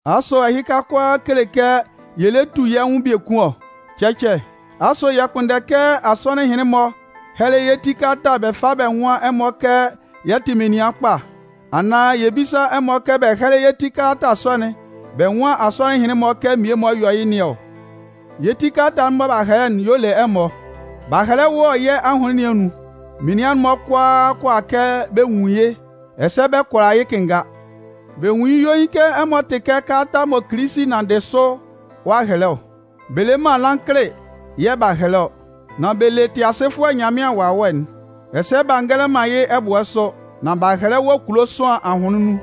Asʋ ɛhɩka kʋalaa kele kɛ yɛ lɛ tu yɛ́ nwʋn biekun ɔ? Cɛcɛ! Asʋ yɛ kpʋnndɛ kɛ asɔnɩn ɛhɩnlɩn-mɔ hɛ́lɛ yɛ́ ti kalata bɛ fá bɛ nwán ɛmɔ kɛ yɛ tɩ menin kpa, anaan yɛ bísa ɛmɔ kɛ bɛ hɛ́lɛ yɛ́ ti kalata sɔ'n bɛ nwán asɔnɩn ɛhɩnlɩn-mɔ kɛ mmie-mɔ yɔ yɩ́ nɩn ɔ? Yɛ́ ti kalata'n mɔ b'a hɛlɛ'n y'ɔ le ɛmɔ. B'a hɛlɛ wɔ yɛ́ ahʋnlɩn nɩn anun. Menian'n-mɔ kʋalaa kʋala kɛ bɛ nwun yɩ́, ɛsɛ bɛ kʋala yɩ́ kɩnnga. Bɛ nwun yɩ́ yuein kɛ ɛmɔ tɩ kɛ kalata mɔ Kilisi nanndɩ yɛ́ sʋ ɔ'a hɛlɛ ɔ. Bɛ le man lankɩlɩ yɛ̂ b'a hɛlɛ ɔ, nan bɛ le Tɩasɩfʋɛ Nyanmɩan Wawɛ'n. Ɛsɛ b'a ngɛlɛ man yɩ́ ɛbʋɛ sʋ, nan b'a hɛlɛ wɔ kulo sʋanlan ahʋnlɩn nun.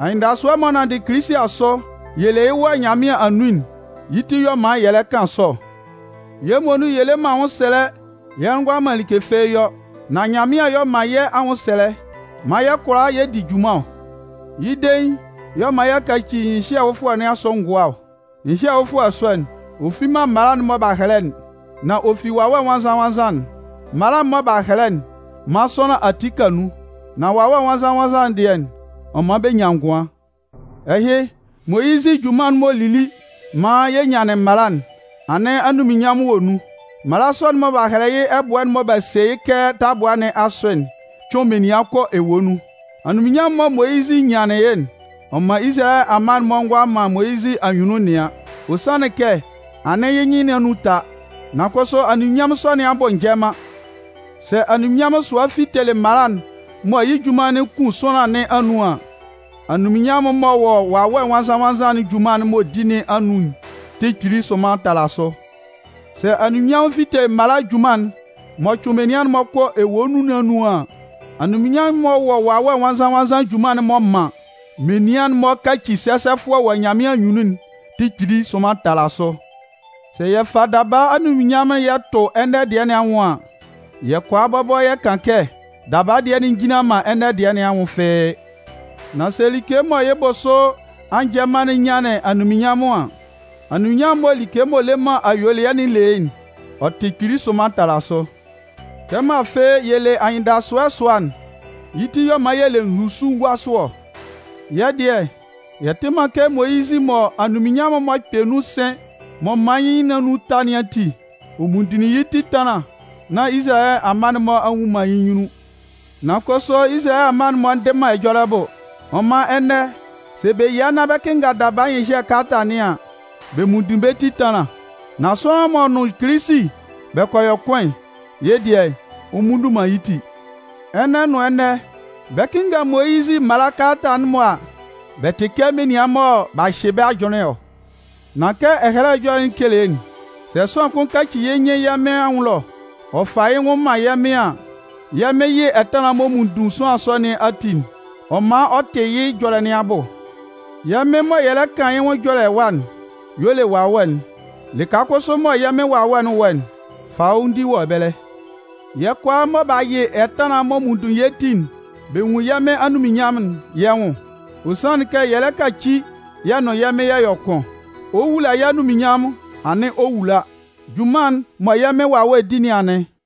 Anyɩndasʋɛ'n m'ɔ nanndɩ Kilisi asʋ yɛ le yɩ́ wɔ Nyanmɩan anun'n yɩ́ ti y'ɔ man yɛ lɛ kan sɔ ɔ. Yɛ́ muonun yɛ le man anwʋnsɛlɛ yɛ ngʋala man like fɩ́ɩ́ yɔ. Nan Nyanmɩan y'ɔ man yɛ́ anwʋnsɛlɛ maan yɛ kʋala yɛ di junman ɔ. Yɩ́ dein y'ɔ man y'a kaci nyɩhyɛ fʋfɔlɛ nɩn asʋ ngʋa ɔ. Nyɩhyɛ fʋfɔlɛ sɔ'n, ɔ fi man mala'n mɔ b'a hɛlɛ'n, nan ɔ fi Wawɛ Nwannzan-nwannzan'n. Mala'n mɔ b'a hɛlɛ'n man sʋanlan ati ka nun, nan Wawɛ Nwannzan-nwannzan'n dɩɛ, ɔ man bɛ nyan ngʋan. Ɛhɩ, Moyizɩ junman'n m'ɔ lili maan yɛ nyanlɩn mala'n, anɩn anunminnyanmʋn wɔ nun. Mala sɔ'n mɔ b'a hɛlɛ yɩ́ ɛbʋɛ'n mɔ b'a se yɩ́ kɛ tabʋa nɩn asʋ'n cʋɩn menian kɔ ewue nun. Anyunminnyanmʋn'n mɔ Moyizɩ nyanlɩn yɩ́'n, ɔ man Izalayɛ amma'n-mɔ ngʋala man Moyizɩ anyunnun nɩan, ɔ sanlɩn kɛ anɩn yɩ́ nyɩn nɩn anun ta. Nan kʋsʋ anunminnyanmʋn sɔ nɩn abʋsʋ njɛ man. Sɛ anunminnyanmʋn sʋa fitelɩ mala'n mɔ yɩ́ junman'n kun sʋanlan nɩn anun an, anunminnyanmʋn m'ɔ wɔ Wawɛ Nwannzan-nwannzan'n junman'n m'ɔ di nɩn anun'n tɩ kpili sʋnman tala sʋ! Sɛ anunminnyanmʋn fitelɩ mala'n junman'n m'ɔ cʋɩn menian kɔ ewue nun nɩn anun an, anunminnyanmʋn m'ɔ wɔ Wawɛ Nwannzan-nwannzan'n junman'n m'ɔ man menian'n-mɔ kaci sɛsɛfʋɛ wɔ Nyanmɩan anyunnun'n tɩ kpili sʋnman tala sʋ! Sɛ yɛ fa daba anunminnyanmʋn'n yɛ tʋ ɛnɛ dɩɛ nɩn anwʋn an, yɛ kʋala bɔbɔ yɛ kan kɛ daba dɩɛ'n njinlan man ɛnɛ dɩɛ nɩn anwʋn fɩ́ɩ́. Nan sɛ like mɔ yɩ́ bʋsʋ a njɛ man'n nyanlɩn anunminnyanmʋn an, anunminnyanmʋn mɔ like m'ɔ le man ayuelɩɛ'n le yɩ́'n, ɔ tɩ kpili sʋnman tala sʋ. Kɛmɔ afɩ yɛ le anyɩndasʋɛ sʋa'n, yɩ́ ti y'ɔ man yɛ le nzusuguasʋ ɔ. Yɛ́ dɩɛ, yɛ tɩ man kɛ Moyizɩ mɔ anunminnyanmʋn'n m'ɔ kpɛ nun sɩn m'ɔ man yɩ́ nyɩn nɩn anun ta nɩn ati, ɔ munndun yɩ́ ti ɛtanlan nán Izalayɛ amma'n-mɔ a nnwun man yɩ́ nyunnun. Nan kʋsʋ Izalayɛ amma'n-mɔ ndɩ man ɛjɔlɛ bʋ. Ɔ man ɛnɛ, sɛ bɛ yia nán bɛ 'kɩnnga daba nyɩhyɛ kalata nɩn an, bɛ munndun bɛ́ ti ɛtanlan. Nan sʋanlan m'ɔ nʋn Kilisi bɛ kɔ yɔ kʋn'n, yɩ́ dɩɛ, ɔ mmunndun man yɩ́ ti. Ɛnɛ nʋn ɛnɛ, bɛ 'kɩnnga Moyizɩ mala kalata'n-mɔ a, bɛ tɩ kɛ menian mɔ b'a hyɩ bɛ́ ajʋnlɩn ɔ. Nan kɛ Ɛhɛlɛ Ɛjɔlɛ'n kele'n, sɛ sʋanlan kʋn kaci yɩ́ nyɩn yɛ́ Mɩn anwʋn ɛlɔ, ɔ fa yɩ́ nwʋn man yɛ̂ Mɩn a, yɛ́ Mɩn yɩ ɛtanlan'n m'ɔ munndun sʋanlan sɔ nɩn ati'n, ɔ man ɔ tɩ yɩ́ ɛjɔlɛ nɩn abʋ. Yɛ́ Mɩn mɔ yɛ lɛ kan yɩ́ nwʋn ɛjɔlɛ ɛwa'n y'ɔ le Wawɛ'n. Lɩka kʋsʋ mɔ yɛ́ Mɩn Wawɛ'n wɔ'n, fanwʋndi wɔ ɛbɛlɛ. Yɛ́ kʋalaa mɔ b'a yɩ ɛtanlan'n mɔ munndun yɛ́ ti'n, bɛ nwun yɛ́ Mɩn anunminnyanmʋn'n yɛ́ nwʋn. Ɔ sanlɩn kɛ yɛ lɛ kaci yɛ nʋn yɛ́ Mɩn yɛ yɔ kʋn. Ɔ 'wula yɛ́ anunminnyanmʋn anɩn ɔ 'wula. Junman'n mɔ yɛ́ Mɩn Wawɛ'n di nɩn anɩn.